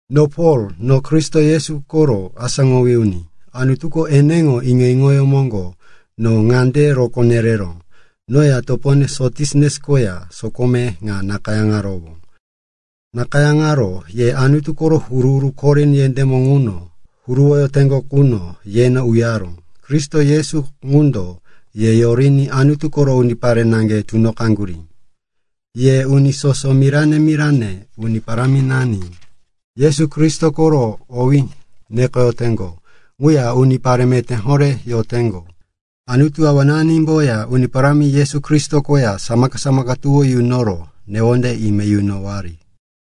No Pol, no Kristo Yesu koro asáŋowí uni. Anutuko eneŋo iŋo-iŋoyó moŋgo no ŋunde rokó nereró. Noya topone Sositenes koya sokome ŋa nakayáŋarowó. Nakayáŋaro ye Anutu koro huru-huru Korin yendémo ŋuno huruwoyoteŋgo qu yeno uyaró. Kristo Yesu ŋundo ye yoriní Anutu koro unipare naŋge tunoqaŋgurí. Yeya uni soso mirane-mirane Uni Paráminani Yesu Kristo koro owí nekoyoteŋgo ŋuya unipare meté horé yoteŋgo. Anutu Awananimboya Uni Parámi Yesu Kristo koya samaka-samaka tuwó yunoro newonde ime yunowari.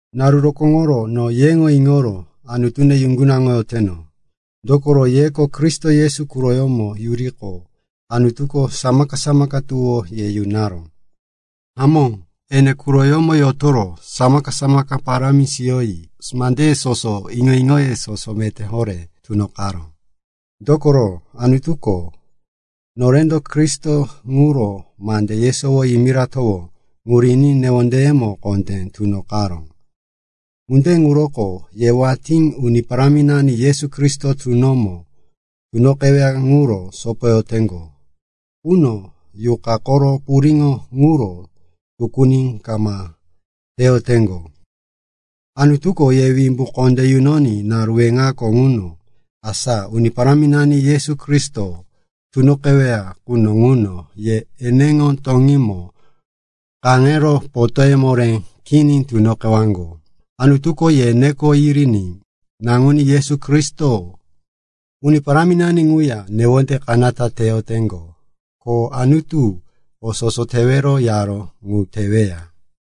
Naru rokóŋoro no yeŋo iŋoro Anutune yuŋgunaŋoyoteno, dokoro yeko Kristo Yesu quroyómo yuriqo, Anutuko samaka-samaka tuwó ye yunaró. Hamó, ene quroyómo yotoro samaka-samaka parámi siyoyi mandeye soso, iŋo-iŋoye soso meté horé tunoqaró. Dokoro Anutuko norendo Kristo ŋuro mande yesowo yimiratowó ŋu riní newondeyemo kondé tunoqaró. Ŋunde ŋuroko ye watí Uni Paráminani Yesu Kristo tunomo tunoqeweya ŋuro sopoyoteŋgo quno Yuqa koro puriŋo ŋuro tukuni kama teyoteŋgo. Anutuko ye wimbu kondé yunoní naru weŋako ŋuno, asa Uni Paráminani Yesu Kristo tunoqeweya quno ŋuno, ye eneŋo toŋímo kaŋero potóye moré kini tunoqewaŋgo. Anutuko ye neko yiriní naŋuní Yesu Kristo, Uni Paráminani ŋuya newonde kanata teyoteŋgo. Ko Anutuko o soso tewero yaró ŋu teweya.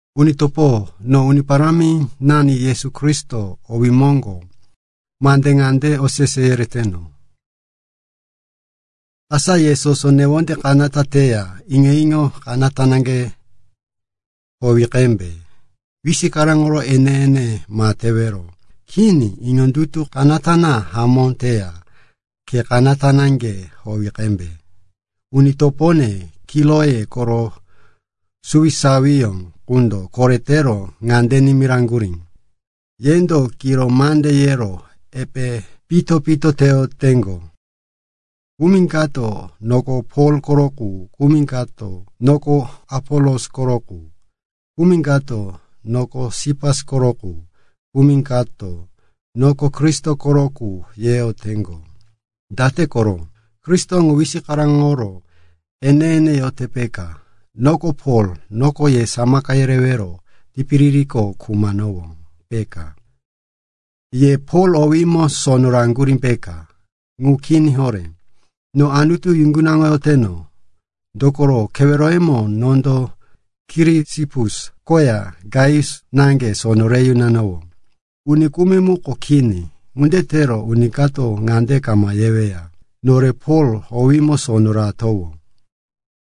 Uni topo, no Uni Paráminani Yesu Kristo owí moŋgo kondé ŋande osese yereteno, asa ye soso newonde kanata teya iŋo-iŋo kanata naŋge howi qembe. Wisikaraŋo ene-ene ma tewero. Kini, iŋondutu kanata na hamó teya, khe kanata naŋge howi qembe. Uni topone, Kiloe koro suwisawiyó qundo koretero ŋande nimiraŋgurí, yendo kiro mande yero epe pito-pito teyoteŋgo. Kumi kato, “Noko Pol koro qu,” kumi kato, “Noko Apolos koro qu,” kumi kato, “Noko Sipas koro qu,” kumi kato, “Noko Kristo koro qu,” yeteŋgo. Date koro? Kristo ŋu wisikaraŋoro ene-ene yote, peka? Noko Pol, noko ye samaka yerewero tipiririko khumanowó, peka? Ye Pol owímo sono raŋgurí, peka? Ŋu kini horé. No Anutu yuŋgunaŋoyoteno, dokoro, keweroyemo nondo Kirisipus koya Gaius naŋge sono re yunanowó, uni kumi muko kini. Ŋunde tero uni kato ŋande kama yeweya, “Nore Pol owímo sono ratowó.”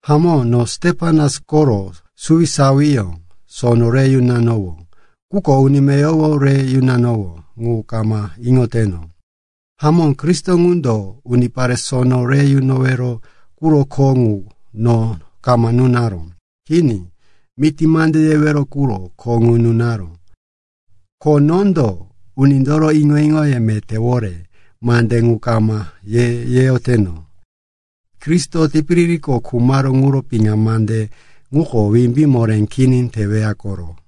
(Hamó, no Stepanas koro suwisawiyó sono re yunanowó, quko uni meyowo re yunanowó ŋu kama iŋoteno.) Hamó, Kristo ŋundo unipare sono re yunowero quro kho ŋu no kama nunaró. Kini, miti mande yewero quro kho ŋu nunaró. Ko nondo unindoro iŋo-iŋo metéwore mande ŋu kama yeyoteno. Kristo tipiririko khumaró ŋuro piŋa mande ŋuko wimbí moré kini teweya koro.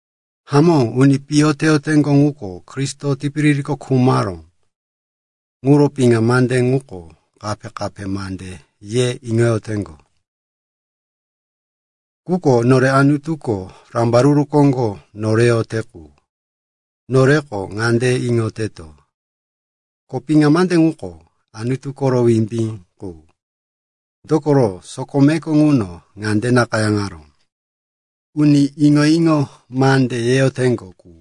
Hamó, uni piyo teyoteŋgo ŋuko, Kristo tipiririko khumaró ŋuro piŋa mande ŋuko kape-kape mande ye iŋoyoteŋgo. Quko nore Anutuko rambaruru koŋgo noreyote qu, noreko ŋande iŋoyoteto, ko piŋa mande ŋuko Anutu koro wimbí qu. Dokoro sokomeko ŋuno ŋande nakayáŋaró, “Uni iŋo-iŋo mande yeyoteŋgo ŋu,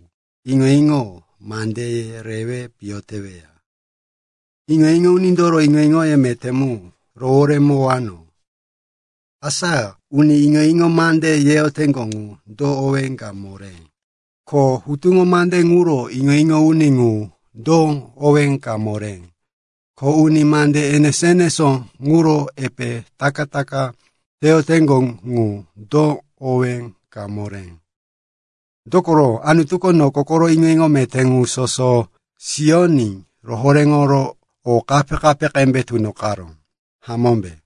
iŋo-iŋo mandeye rewe piyo teweya; iŋo-iŋo unindoro iŋo-iŋoye meté mu roworemowano.” Asa uni iŋo-iŋo mande yeyoteŋgo ŋu, do owé ka moré? Ko hutuŋo mande ŋuro iŋo-iŋo uni ŋu, do owé ka moré? Ko uni mande enesó-enesó ŋuro epe taka-taka teyoteŋgo ŋu, do owé ka moré? Dokoro Anutuko noko koro iŋo-iŋo meté ŋu soso siyoní rohoréŋoro o kape-kape qembe tunoqaró, hamómbe?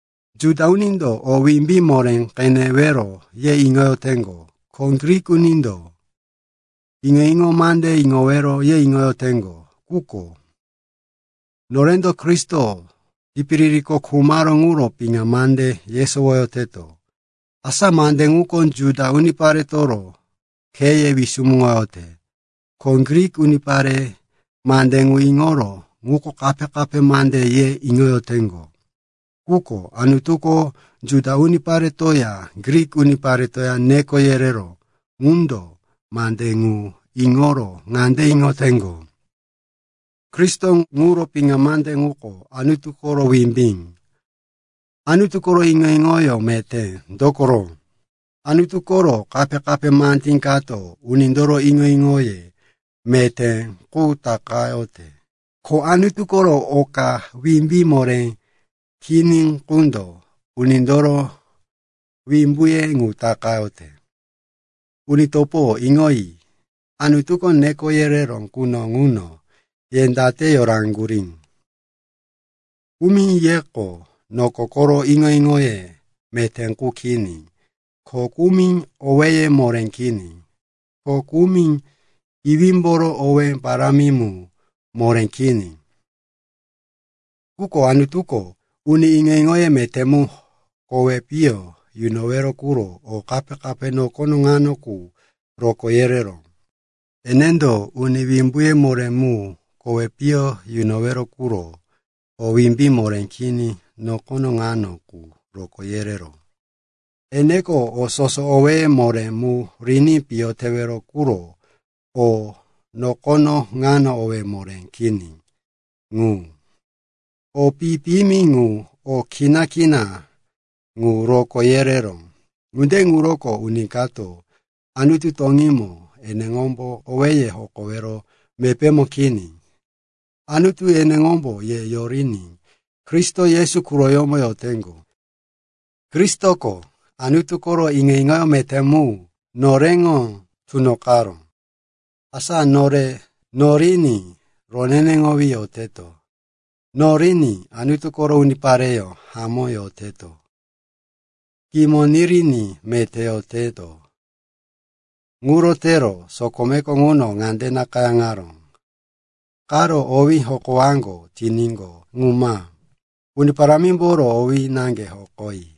Juda unindo o wimbí moré qenewero ye iŋoyoteŋgo. Ko Grik unindo iŋo-iŋo mande iŋowero ye iŋoyoteŋgo. Quko norendo Kristo tipiririko khumaró ŋuro piŋa mande yesowoyoteto. Asa mande ŋuko Juda uniparetoro kheye wisumuŋoyote, ko Grik unipare mande ŋu iŋoro, ŋuko kape-kape mande, ye iŋoyoteŋgo. Quko Anutuko Juda uniparetoya Grik uniparetoya neko yereró ŋundo mande ŋu iŋoro ŋande iŋoteŋgo, Kristo ŋuro piŋa mande ŋuko Anutu koro wimbí, Anutu koro iŋo-iŋoyó meté. Dokoro Anutu koro kape-kape mandí kato unindoro iŋo-iŋoye meté qu takayote, ko Anutu koro oka wimbí moré kini qundo unindoro wimbuye ŋu takayote. Uni topo, iŋoyi, Anutuko neko yereró quno ŋuno ye date yoraŋgurí? Kumi yeko noko koro iŋo-iŋoye meté qu kini. Ko kumi owéye moré kini. Ko kumi iwímboro owé parámi mu moré kini. Quko Anutuko uni iŋo-iŋoye meté mu kowi piyo yunowero quro o kape-kape nokono ŋano qu rokó yereró. Enendo uni wimbuye moré mu kowi piyo yunowero quro o wimbí moré kini nokono ŋano qu rokó yereró. Enendo o soso owéye moré mu riní piyo tewero quro o nokono ŋano owé moré kini ŋu, o pi-piyimi ŋu, o kina-kina ŋu rokó yereró. Ŋunde ŋuroko uni kato Anutu toŋímo eneŋombo owéye hokowero mepémo kini. Anutu eneŋombo ye yoriní Kristo Yesu quroyómo yoteŋgo. Kristoko Anutu koro iŋo-iŋo meté mu noreŋo tunoqaró, asa nore noriní roneneŋowí yoteto, noriní Anutu koro unipareyó hamó yoteto, kimo niriní meté yoteto. Ŋuro tero sokomeko ŋuno ŋande nakayáŋaró, “Karo owí hokowaŋgo tiníqo, ŋu ma. Uni Parámimboro owí naŋge hokoyi.”